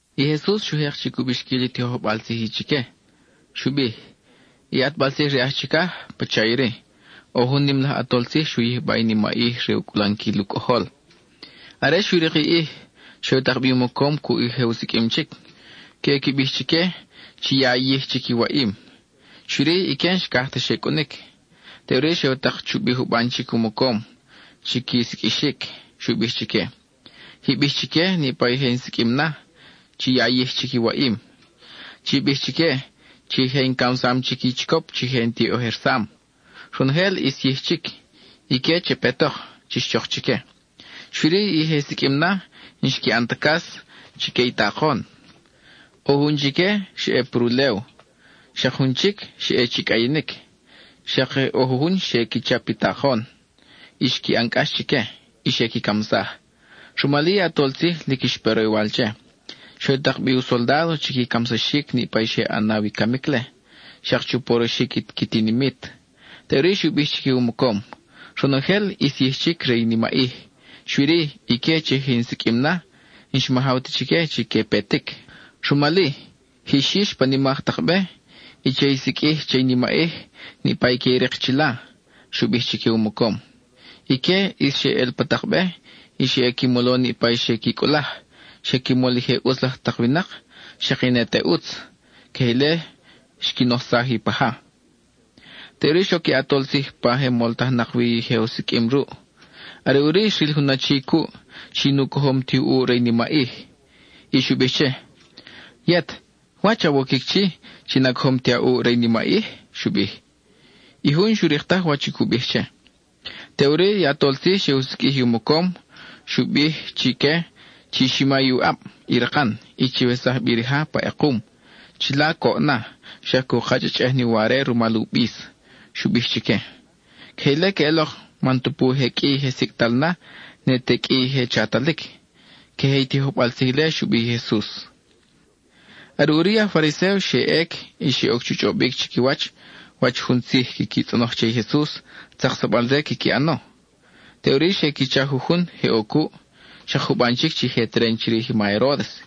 I Jesus xu jek chic u bixquil i tijojbal tzij chique. Xu bij: —I ʼatbal tzij re aj chicaj, pacha iri: ʼO jun nim laj ʼatol tzij xu yijba i nimaʼij re u cʼulanquil i u cʼojol. Are xu rik i ʼij, xe u tak bi u mocom cuʼ i je siqʼuim chic, queʼe qui bij chique chi ya yij chic i waʼim. Xui-ri, ique n-xcaj ta xe cʼunic. Teʼuri xe u tak chubi juban chic u mocom chi qui siqʼuixic. Xu bij chique: “Ji bij chique niʼpa i je in siqʼuim na, chi ya yij chic i waʼim. Chi bij chique chi je in camsam chic i chicop chi je in tiʼojersam. Ronojel ʼis yij chic; ique che petok, chix chok chique.” Xui-ri, i je siqʼuim na, n-xqui ʼan ta cas chique i takon. ʼO jun chique xa ʼe pa rulew, xak jun chic xa ʼe chi cʼayinic. Xak je ʼo jujun xe qui chap i takon y xqui ʼan cʼax chique y xe qui camsaj. Rumal-i, i ʼatol tzij lic xpe roywal che; xe u tak bi u soldádo chi qui camsaxic niʼpa i xe ʼanaw i camic-le, xak chu poroxic i qui tinimit. Teʼuri xu bij chique u mocom: “Ronojel ʼis yij chic re i nimaʼij, xui-ri ique chi je in siqʼuim na, n-xmajaw ta chique chi que petic. Rumal-i, jix yix pa nimak tak be, y che i siqʼuij che i nimaʼij niʼpa i que i rik chila,” xu bij chique u mocom. Ique ʼis xe ʼel pa tak be, y xe qui mol niʼpa i xe qui cʼulaj. Xe qui mol i je ʼutz laj tak winak, xak i ne te ʼutz. Queje ile xqui nojsaj i u paja. Teʼuri xoc i ʼatol tzij pa je moltajnak wi i je u siqʼuim ruʼ. Are ʼuri xril jun achi cuʼ chi nu cojom ti u ʼuʼ re i nimaʼij. Y xu bij che: “Yet, ¿wach awoquic chi, chi na cojom ti a ʼuʼ re i nimaʼij?” xu bij. I jun n-xu rik taj wach cu bij che. Teʼuri i ʼatol tzij xe u siqʼuij i u mocom, xu bij chique: “Chi xima i u ʼab, i rakan, y chiwesaj bi rija pa ʼekum. Chila coʼ na, xak cu kachʼachʼej ni uware rumal u bis,” xu bij chique. Queje ile queʼelok man tupu je qʼui i je sicʼtal na, ne te qʼui je chatalic. (Queje i tijojbal tzij ile xu bij i Jesus.) Are ʼuri i aj Fariséo xe ʼec y xe oc chu chʼobic chiquiwach wach jun tzij quiqui tzʼonoj che i Jesus, tzaksabal-re quiqui ʼano. Teʼuri xe qui cha jujun je ʼo cuʼ, xak juban chic chi je teren chirij i ma Heródes,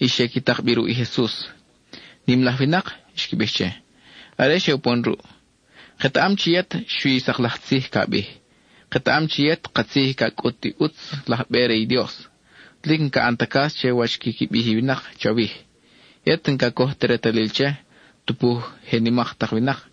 y xe qui tak bi ruʼ i Jesus. —Nim laj winak —xqui bij che, are xe upon ruʼ—, ketaʼam chi yet xui i sak laj tzij ca bij. Ketaʼam chi yet katzij ca cʼut i ʼutz laj be re i Dios, lic n-ca ʼan ta cas che wach quiqui bij i winak chawij. Yet n-ca coj ta retalil che, tupu je nimak tak winak.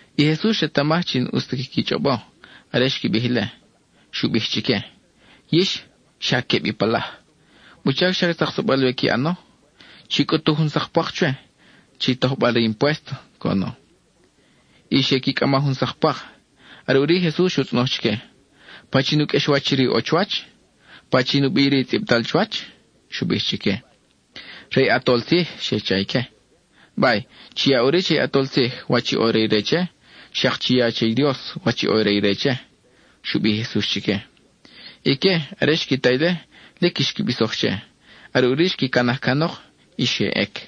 I Jesus xretamaj chi n-ʼus ta quiqui chʼobo are xqui bij ile. Xu bij chique: —Yix, ¡xa queb i palaj! ¿Wuchac xa tzaksabal-we qui ʼano? Chi cʼutu jun sak pwak chwe, chi tojbal re impuésto —coʼono. Y xe qui cʼama jun sak pwak. Are ʼuri i Jesus xu tzʼonoj chique: —¿Pachin u qʼuexwach iri ʼo chuwach? ¿Pachin u bi iri tzʼibtal chuwach? —xu bij chique. —Re i ʼatol tzij —xe cha ique. —Bay, chi ya ʼuri che i ʼatol tzij wach ʼo re ire che, xak chi ya che i Dios wach ʼo re ire che —xu bij i Jesus chique. Ique, are xqui ta ile, lic xqui bisoj che. Are ʼuri xqui canaj canok y xe ʼec.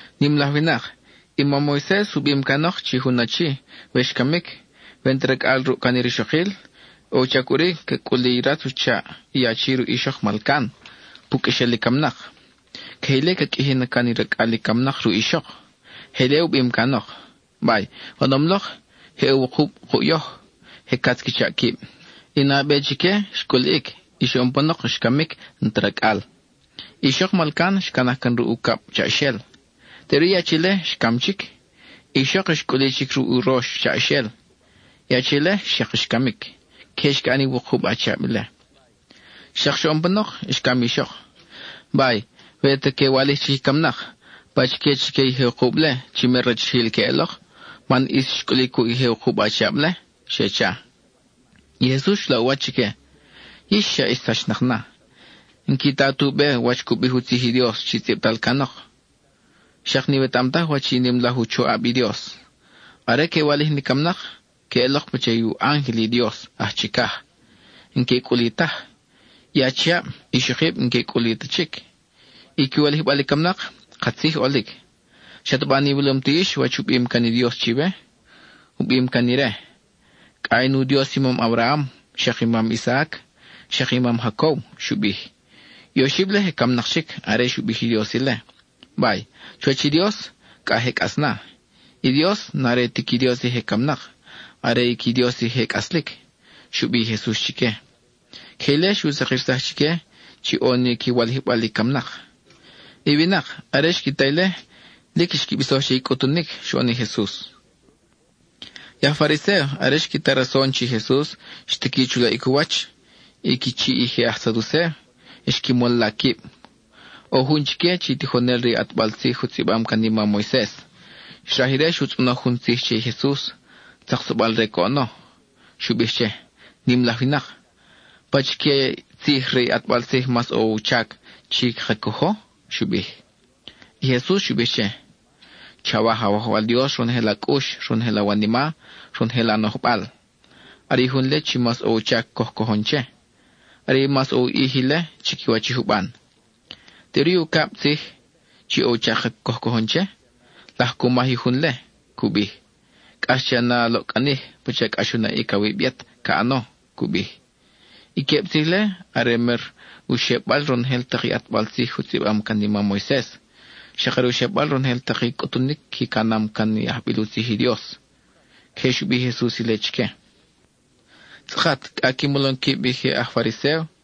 —Nim laj winak, i mam Moises u bim canok chi jun achi, we xcamic, we n-ta racʼal ruʼ can i rixokil, ʼo u chac ʼuri ca cʼuli i ratz u chaʼ i achi ruʼ ixok malcan, pu qʼuexel i camnak. Queje ile ca qʼuiji na can racʼal i camnak ruʼ ixok. Je ile u bim canok. Bay, oʼonom lok, je ʼo wukub kuʼ yoj, je catz qui chaʼ quib. I nabe chique xcʼuliʼic, y xoʼon panok xcamic, n-ta racʼal. I ixok malcan xcanaj can ruʼ ucab chaʼaxel. Teʼuri i achi-le xcam chic, i ixok xcʼuli chic ruʼ urox chaʼaxel. I achi-le xak xcamic. Queje xqui ʼan i wukub achiab-le. Xak xoʼon panok, xcam i ixok. Bay, we ta que walij chic i camnak, ¿pachique chique i je wukub-le, chi mer rachijil queʼelok? Man ʼis xcʼuli cuʼ i je wukub achiab-le —xe cha. I Jesus xu laʼ u wach chique: —Yix xa ix sachnak na; n-qui ta tu be wach cu bij u tzij i Dios chi tzʼibtal canok; xak n-iwetaʼam taj wach i nim laj u choʼab i Dios. Are que walij ni camnak, que ʼelok pacha i u ángel i Dios aj chicaj; n-que cʼuli taj. I achiab, i ixokib n-que cʼuli ta chic. I qui walijbal i camnak, katzij ʼolic. ¿Xataba n-iwilom ti yix wach u bim can i Dios chiwe? U bim can ire: “Cʼa in u Dios i mam Abraham, xak i mam Isaac, xak i mam Jacob,” xu bij. I oxib-le je camnak chic are xu bij i Dios ile. Bay, chuwach i Dios, c a je cʼas na; i Dios n-are ti qui Dios i je camnak, are i qui Dios i je cʼaslic —xu bij i Jesus chique. (Queje ile xu sakirsaj chique chi ʼo ni qui walijbal i camnak). I winak, are xqui ta ile, lic xqui bisoj che i cʼutunic xoʼon i Jesus. I aj Fariséo, are xqui ta rason chi Jesus xtiqui chu laʼic u wach i qui chiʼ i je aj Saducéo, xqui mol la quib. ʼO jun chique chi tijonel re i ʼatbal tzij u tzʼibam can i mam Moises. Xraj ire xu tzʼonoj jun tzij che i Jesus, tzaksabal-re coʼono. Xu bij che: —Nim laj winak, ¿pachique tzij re i ʼatbal tzij mas ʼo u chac chi caka cojo? —xu bij. I Jesus xu bij che: —“Chawaj Awajwal Dios ronojel a cʼux, ronojel awanima, ronojel a nojbal.” Are i jun-le chi mas ʼo u chac coj cojon che; are mas ʼo u ʼij ile chiquiwach i juban. Teʼuri i ucab tzij (chi ʼo u chac coj cojon che) laj cu maj i jun-le. Cu bij: “Cʼax che a na a loʼcʼanij pacha cʼax u naʼic awib yet ca ʼano,” cu bij. I queb tzij-le are mer u xebal ronojel tak i ʼatbal tzij u tzʼibam can i mam Moises, xak are u xebal ronojel tak i cʼutunic qui canam can i ajbil u tzij i Dios. (Queje xu bij i Jesus ile chique.) Tzʼakat cʼa qui molom quib i je aj Fariséo,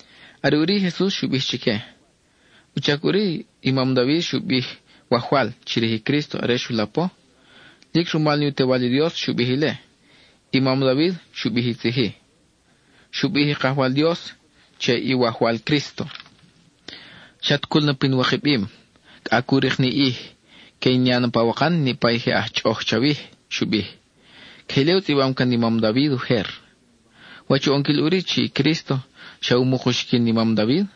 Are ʼuri i Jesus xu bij chique: —¿Wuchac ʼuri i mam David xu bij “Wajwal” chirij i Crísto are xu lapo? Lic rumal ni u Tewal i Dios xu bij ile. I mam David xu bij i tzij-i: Xu bij i Kajwal Dios che i Wajwal Crísto: “Chat cul na pin wikabim, cʼa cu rik ni ʼij que in ya na pawakan niʼpa i je aj chʼoʼoj chawij,” xu bij. Queje ile u tzʼibam can i mam David ujer. ¿Wach u ʼonquil ʼuri chi Crísto xa umuk uxiquin i mam David?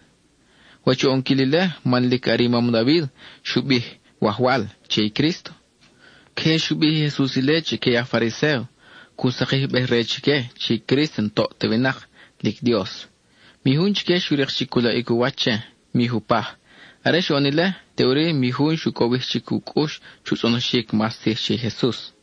¿Wach u ʼonquil ile man lic are i mam David xu bij “Wajwal” che i Crísto? (Queje xu bij i Jesus ile chique i aj Fariséo, cu sakijbej-re chique chi Crísto n-toʼ ta winak, lic Dios.) Mi jun chique xu rik chic u laʼic u wach che, mi jupaj. Are xoʼon ile, teʼuri mi jun xu cowij chic u cʼux chu tzʼonoxic mas tzij che i Jesus.